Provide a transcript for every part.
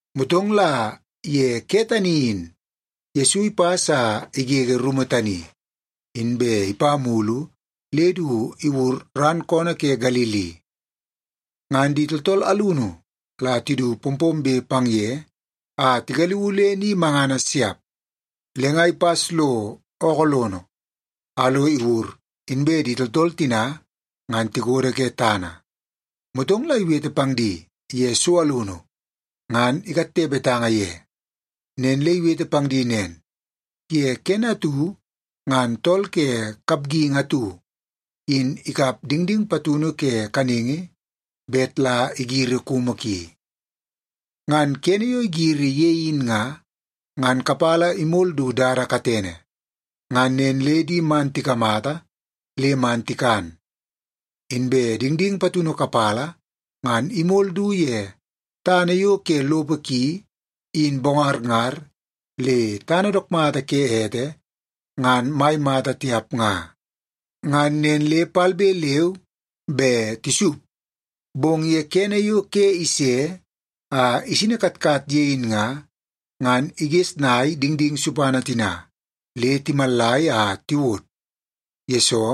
Motong la ye ke tani in Yesu ipas a igege rumu tani, inbe ipa mulu le du iwur ran koonoo ke Galili. Ngan di tooltool alunu la tidu pompombe pang ye a tigaliuu le ni mangana siap. Le nga ipas lo ookoo lono, a lo iwur, inbe di tooltool tina ngan tikodo ke tana. Motong la iwete pang di ye so alunu ngan ikatte betanga ye. Nen le iwete pang di nen, “Ye kene atu ngan tool ke kapgingi atu in ikap dingding patunu ke kaningi bet la igiri kumu ki. Ngan kene yo igiri ye in nga, ngan kapala imol du dada katene. Ngan nen le di man tikamata le man tikan. Inbe dingding patunu kapala ngan imol du ye tana yo ke lopo ki in bongarngar le tana dook mata ke ete ngan mai mata tiap nga. Ngan nen le palbe leu be tisup, bong ye kene yo ke ise a isini katkat ye in nga, ngan igesnai dingding supana tina le timallai a tiwod, yesoo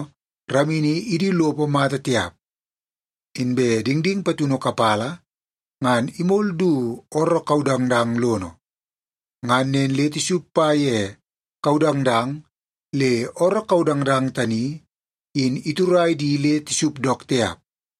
ramini idu lopo mata tiap. Inbe dingding patunu kapala ngan imol du ooroo kaudangdang lono. Ngan nen le tisup pa ye kaudangdang le ooroo kaudangdang tani in iturai di le tisup dook tiap.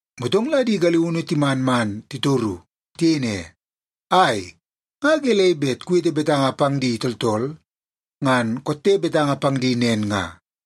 Motong la di galiunu timan man titoru. Tiyei ne, “Ai, nga gelei bet kuwete betanga pang di tooltool ngan kotte betanga pang di nen nga?”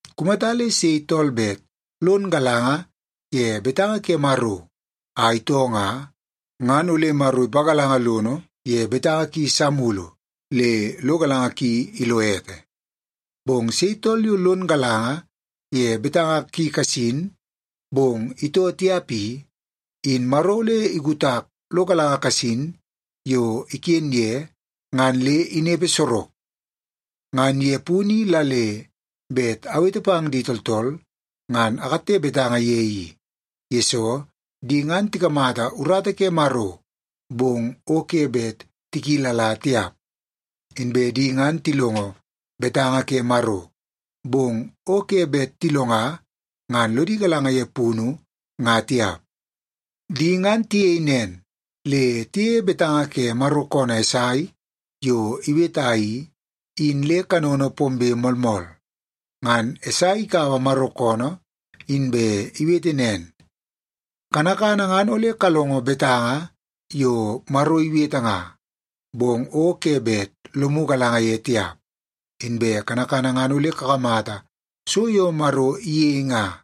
Kumata le sei tool bet lon galanga ye betanga ke Maro a itoo nga, ngan ole Maro ipagalanga lono ye betanga ki sa mulu le lo galanga ki ilo ete. Bong sei tool yo lon galanga ye betanga ki kasin, bong itoo tiap i, in Maro ole ikutak lo galanga kasin yo iken ye ngan le inepe sorok. Ngan ye punu i la le bet awete pang di tooltool, ngan akatte betanga ye i, yesoo di ngan tikamata urata ke Maro, bong o ke bet tikilala tiap. Inbe di ngan tilongo betanga ke Maro, bong o ke bet tilonga ngan lodi galanga ye punu nga tiap. Di ngan tiyei nen, le tiyeie betanga ke Maro koonoo Esai yo iweta i, in le kanono pombe moolmool. Ngan Esai ikaua Maro koonoo inbe iwete nen, ‘Kanakana ngan ole kalongo betanga yo Maro iwete nga, bong o ke bet lomu galanga ye tiap. Inbe kanakana ngan ole kakamata so yo Maro iyei nga,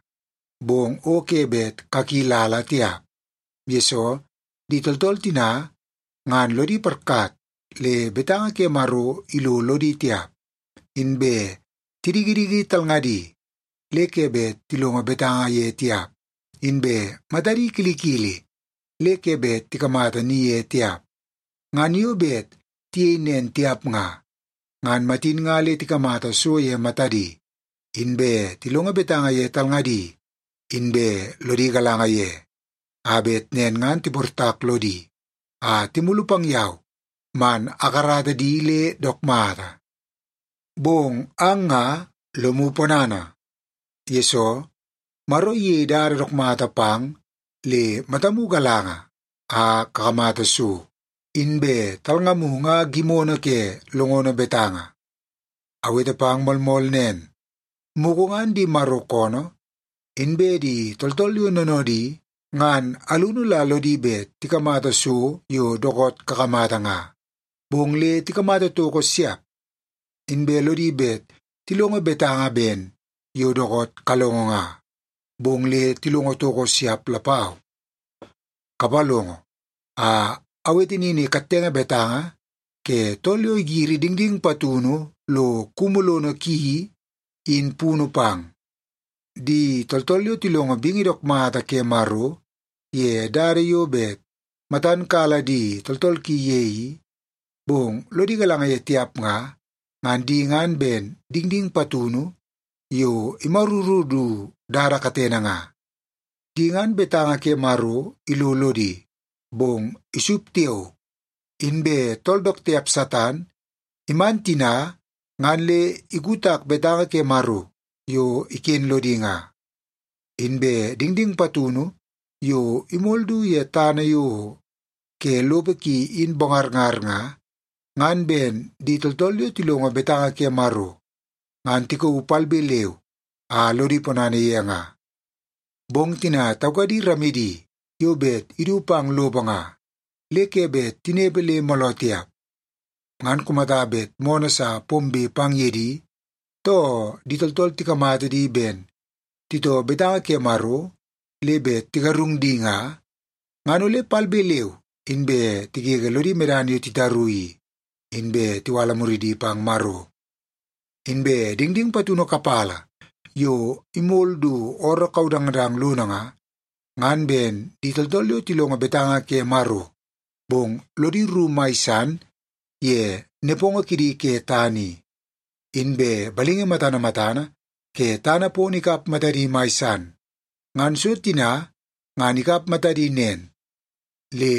bong o ke bet kakilala tiap. Yesoo, di tooltool tina ngan lodi parkat le betanga ke Maro ilo lodi tiap, inbe tidikidiki talngadi le ke bet tilongo betanga ye tiap, inbe matadi kilikili le ke bet tikamata ni ye tiap. Ngan yo bet tiyei nen tiap nga, ngan matin nga le tikamata so ye matadi, inbe tilongo betanga ye talngadi, inbe lodi galanga ye, a bet nen ngan tiportak lodi a timulu pang yau man akarata di le dook mata.’ Bong ang nga lomu ponana, yesoo Maro iyei dada dook mata pang le matamu galanga a kakamata so, inbe talngamu nga gimono ke longono betanga. Awete pang moolmool nen, mugu ngan di Maro koonoo inbe di tooltool yo noonoodi ngan alunu la lodi bet tikamata so yo dookoot kakamata nga, bong le tikamata toko siap. Inbe lodi bet tilongo betanga ben yo dookoot kalongo nga, bong le tilongo toko siap lapau. “Kapalongo a awete nini kattenge betanga ke tool yo igiri dingding patunu lo kumu lono ki i, in punu pang. Di tooltool yo tilongo bingi dook mata ke Maro ye dada yo bet matan kala di tooltool ki ye i, bong lodi galanga ye tiap nga, ngan di ngan ben dingding patunu yo imaruru du dada katene nga. Di ngan betanga ke Maro ilo lodi, bong isup tiao, inbe tool dook tiap Satan iman tina ngan le ikutak betanga ke Maro yo iken lodi nga. Inbe dingding patunu yo imol du ye tana yo ke lopo ki in bongarngar nga, ngan ben di tooltool yo tilongo betanga ke Maro ngan tikauu palbe leu a lodi ponana ye nga. Bong tina taukadi ramidi yo bet idu pang lopo nga, le ke bet tinepe le mooloo tiap. Ngan kumata bet moonoo sa pombe pang ye di, too di tooltool tikamata di ben titoo betanga ke Maro le bet tigarung di nga, ngan ole palbe leu inbe tigege lodi medana yo titaru i, inbe tiwala muridi pang Maro. Inbe dingding patunu kapala yo imol du ooroo kaudangdang lono nga, ngan ben di tooltool yo tilongo betanga ke Maro, bong lodi rru mai san ye nepongo kidi ke tana i, inbe balingi matana matana ke tana pono ikap matadi mai san. Ngan so tina ngan ikap matadi nen, le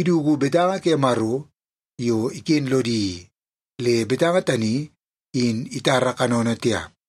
iduku betanga ke Maro yo iken lodi i, le betanga tani in itara kanono tiap.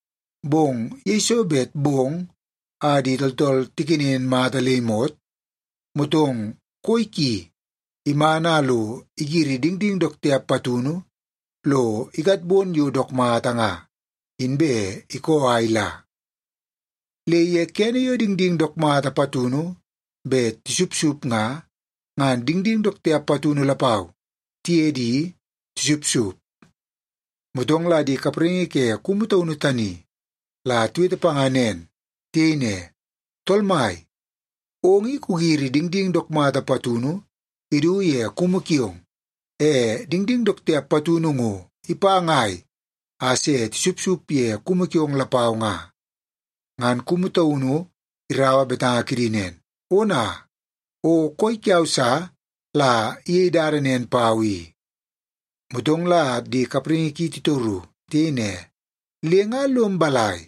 Bong yeiso bet bong a di tooltool tikenen mata le imot, motong koi ki iman a lo igiri dingding dook tiap patunu lo ikatbon yo dook mata nga, inbe ikoo a ila. Le ye kene yo dingding dook mata patunu bet tisupsup nga, ngan dingding dook tiap patunu lapau tiye di tisupsup. “Motong la di kapraingi ke kumu taunu tani la tiwete panga nen. Tiyei ne, ‘Tool mai, ong i kugiri dingding dook mata patunu idu ye kumu kiong, e dingding dook tiap patunu ngo ipa ngai a se tisupsup ye kumu kiong lapau nga?’ “Ngan kumu taunu iraua betanga kidi nen, ‘Ona, o koi kiau sa la iyei dada nen pau i.’ “Motong la di kapraingi ki titoru. Tiyei ne, ‘Le nga lom balai,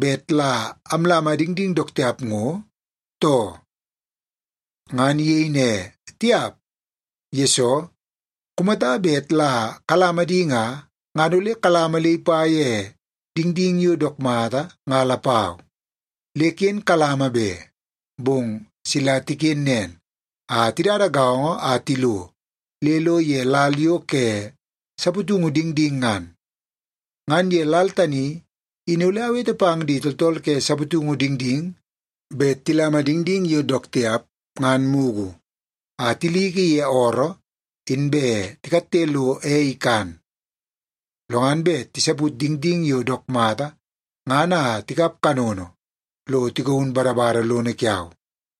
bet la amlama dingding dook tiap ngo, too?’ “Ngan iyei ne, ‘Tiap. Yesoo, kumata bet la kalama di nga, ngan ole kalama le ipa ye dingding yo dook mata nga lapau. Le ken kalama be, bong sila tiken nen a tidada gaongo a tilo le lo ye lal yo ke saputungu dingding ngan. Ngan ye lal tani in ole awete pang di tooltool ke saputungu dingding bet tilama dingding yo dook tiap ngan mugu a tiliki ye ooroo, inbe tikatte lo ei ikan. Lo ngan bet tisaput dingding yo dook mata ngan a tikap kanono lo tigaun badabada lono kiau.’”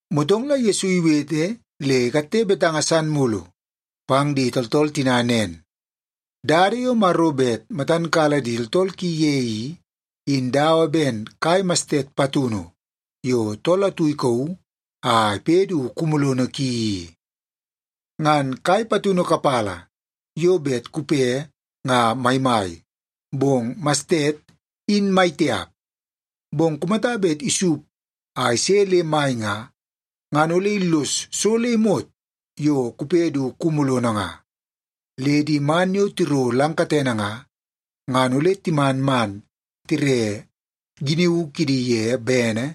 Motong la Yesu iwete le ikatte betanga san mulu pang di tooltool tina nen, “Dada yo Maro bet matan kala di tooltool ki ye i, in dawa ben kai mastet patunu yo tool atu ikauu a ipe du kumu lono ki i. Ngan kai patunu kapala yo bet kupe nga maimai, bong mastet in maitiap. Bong kumata bet isup a ise le mai nga, ngan ole illos so le imot yo kupe du kumu lono nga. Le di man yo tiro lang katene nga, ngan ole timan man tire giniu kidi ye bene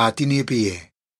a tinepe ye.”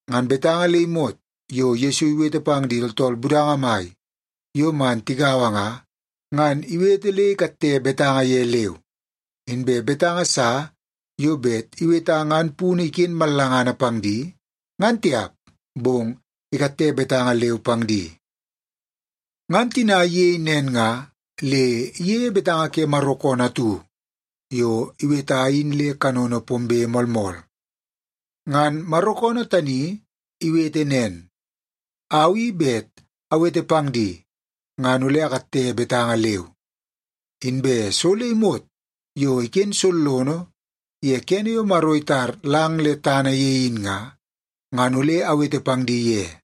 Ngan betanga le imot yo Yesu iwete pang di tooltool budanga mai yo man tigaua nga, ngan iwete le ikatte betanga ye leu. Inbe betanga sa yo bet iweta ngan punu iken mallangana pang di ngan tiap, bong ikatte betanga leu pang di. Ngan tina iyei nen nga, le iyeie betanga ke Maro koonoo atu yo iweta in le kanono pombe moolmool. Ngan Maro koonoo tani iwete nen, “Au i bet awete pang di, ngan ole akatte betanga leu. Inbe so le imot yo iken sollono ye kene yo Maro itar lang le tana ye in nga, ngan ole awete pang di ye.”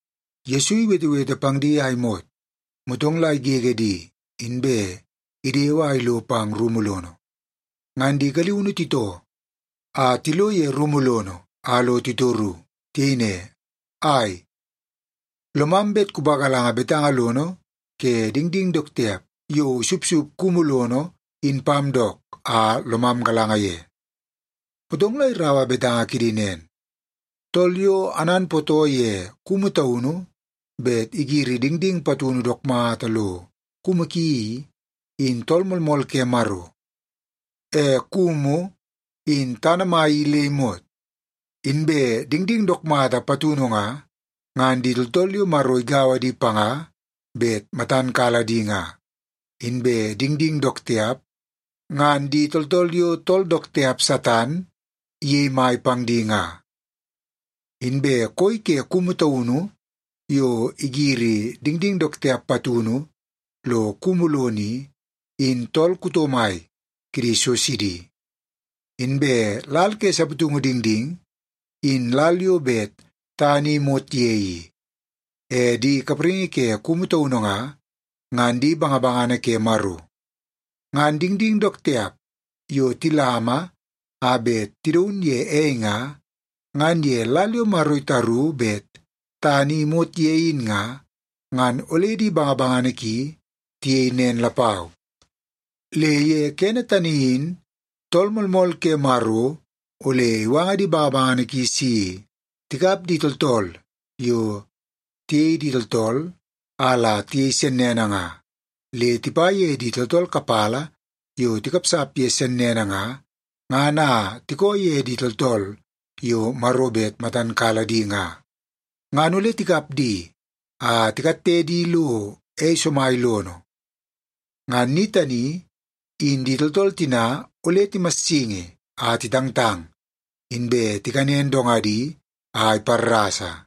Yesu iwetewete pang di a imot, motong la igege di, inbe idewe a ilo pang rumu lono. Ngan di galiunu titoo a tilo ye rumu lono a lo titoru. Tiyei ne, “Ai, lomam bet kupagalanga betanga lono ke dingding dook tiap yo isupsup kumu lono in pam dook a lomam galanga ye.” Motong la iraua betanga kidi nen, “Tool yo ananpootoo ye kumu taunu bet igiri dingding patunu dook mata lo kumu ki i, in Tool Moolmool ke Maro. E kumu in tana mai i le imot. Inbe dingding dook mata patunu nga, ngan di tooltool yo Maro igaua di panga bet matan kala di nga. Inbe dingding dook tiap, ngan di tooltool yo tool dook tiap, Satan, iyei mai pang di nga. Inbe koi ke kumu taunu yo igiri dingding dook tiap patunu lo kumu lono i, in tool kuto mai kidi so sidi. Inbe lal ke saputungu dingding, in lal yo bet tana i imot ye i. E di kapraingi ke kumu taunu nga, ngan di bangabangana ke Maro. Ngan dingding dook tiap yo tilama a bet tidaun ye ei nga, ngan ye lal yo Maro itaru bet tana i imot ye in nga, ngan ole di bangabangana ki tiyei nen lapau. Le ye kene tani in Tool Moolmool ke Maro ole iwanga di bangabangana ki si tikap di tooltool yo tiyei di tooltool a la tiyei sennene nga, le tipa ye di tooltool kapala yo tikapsap ye sennene nga, ngan a tikoo ye di tooltool yo Maro bet matan kala di nga. Ngan ole tikap di a tikatte di lo ei somai lono. Ngan ni tani in di tooltool tina ole timassingi a titangtang, inbe tikanen dongadi a iparrasa.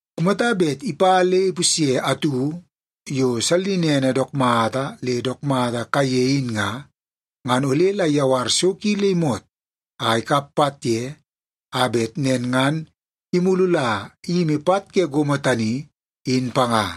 Kumata bet ipa le ipusye atu yo sallinene dook mata le dook mata kaiye in nga, ngan ole la iyawar so ki le imot a ikap pat ye, a bet nen ngan imulu la iyimi pat ke gomo tani, in panga.”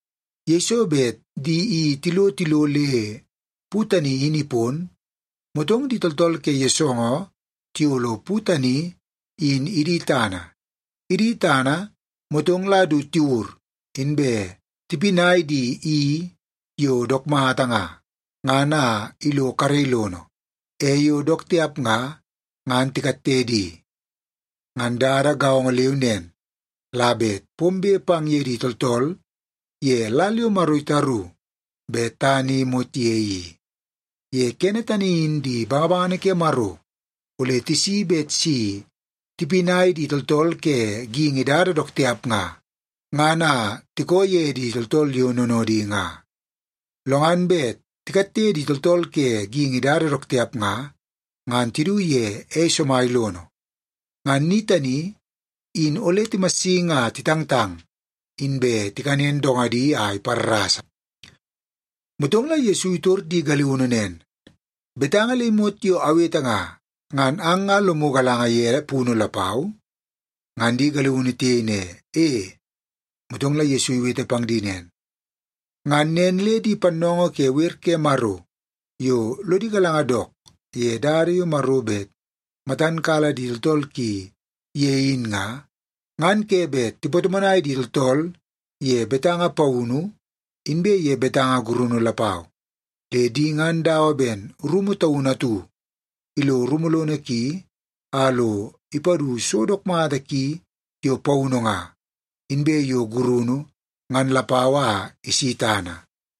Yeiso bet di i tilo tilo le pu tani in ipon, motong di tooltool ke yoosoongoo tiyolo pu tani in idi tana. Idi tana, motong la du tiwur, inbe tipinai di i yo dook mata nga, ngan a ilo karei lono. E yo dook tiap nga, ngan tikatte di. Ngan dada gaongo leu nen la bet pombe pang ye di tooltool ye lal yo Maro itaru bet tana i imot ye i. Ye kene tani in di bangabangana ke Maro ole tisi bet si tipinai di tooltool ke geingi dada dook tiap nga, ngan a tikoo ye di tooltool yo noonoodi nga. Lo ngan bet tikatte di tooltool ke geingi dada dook tiap nga, ngan tidu ye ei somai lono. Ngan ni tani in ole timassingi a titangtang, inbe tikanen dongadi a iparrasa.” Motong la Yesu itor di galiunu nen, “Betanga le imot yo awete nga, ngan ang nga lomu galanga ye punu lapau?” Ngan di galiunu tiyei ne, “E.” Motong la Yesu iwete pang di nen, “Ngan nen le di pannoongoo ke wer ke Maro yo lodi galanga dook ye dada yo Maro bet matan kala di tooltool ki ye in nga, ngan ke bet tipatomonai di tooltool ye betanga paunu inbe ye betanga gurunu lapau. Le di ngan dawa ben rumu taunu atu ilo rumu lono ki a lo ipadu so dook mata ki yo paunu nga, inbe yo gurunu ngan lapau a isi tana.”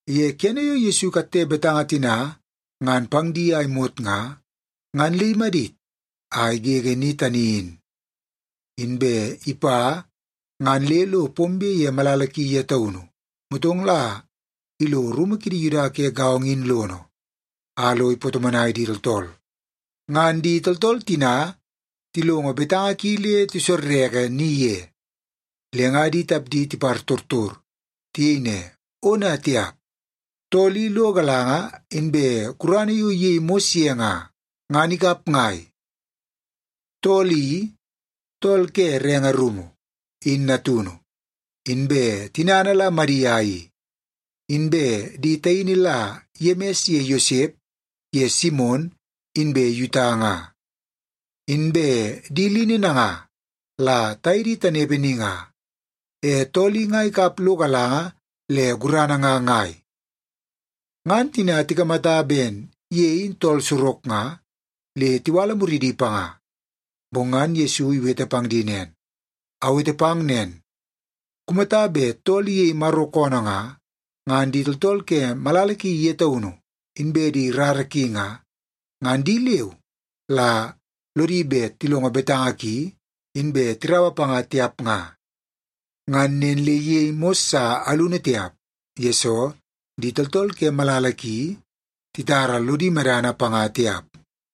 Ye kene yo Yesu ikatte betanga tina ngan pang di a imot nga, ngan le imadit a igege ni tani in. Inbe ipa ngan le lo pombe ye malala ki ye taunu, motong la ilo rumu kidi Yuda ke gaongo in lono, a lo ipatomonai di tooltool. Ngan di tooltool tina tilongo betanga ki le tisorreke ni ye, le nga di tapdi tipartortor. Tiyei ne, “Ona tiap! Tool i lo galanga inbe gurana yo iyei mos ye nga, ngan ikap ngai? Tool i, tool ke renge rumu, in natunu. Inbe tinana la Madia i. Inbe di taini la Yemis ye Yosep ye Simon inbe Yuta nga. Inbe di lini nanga la taye di tanepe ni nga. E tool i nga ikap lo galanga le gurana nga ngai?” Ngan tina tikamata ben ye in tool sorok nga, le tiwala muridi panga. Bong ngan Yesu iwete pang di nen, “Awete pang nen, kumata bet tool iyei Maro koonoo nga, ngan di tooltool ke malala ki ye taunu inbe di rara ki nga, ngan di leu la lodi bet tilongo betanga ki inbe tiraua panga tiap nga.” Ngan nen le iyei mos sa alunu tiap, yesoo di tooltool ke malala ki titara lodi medana panga tiap.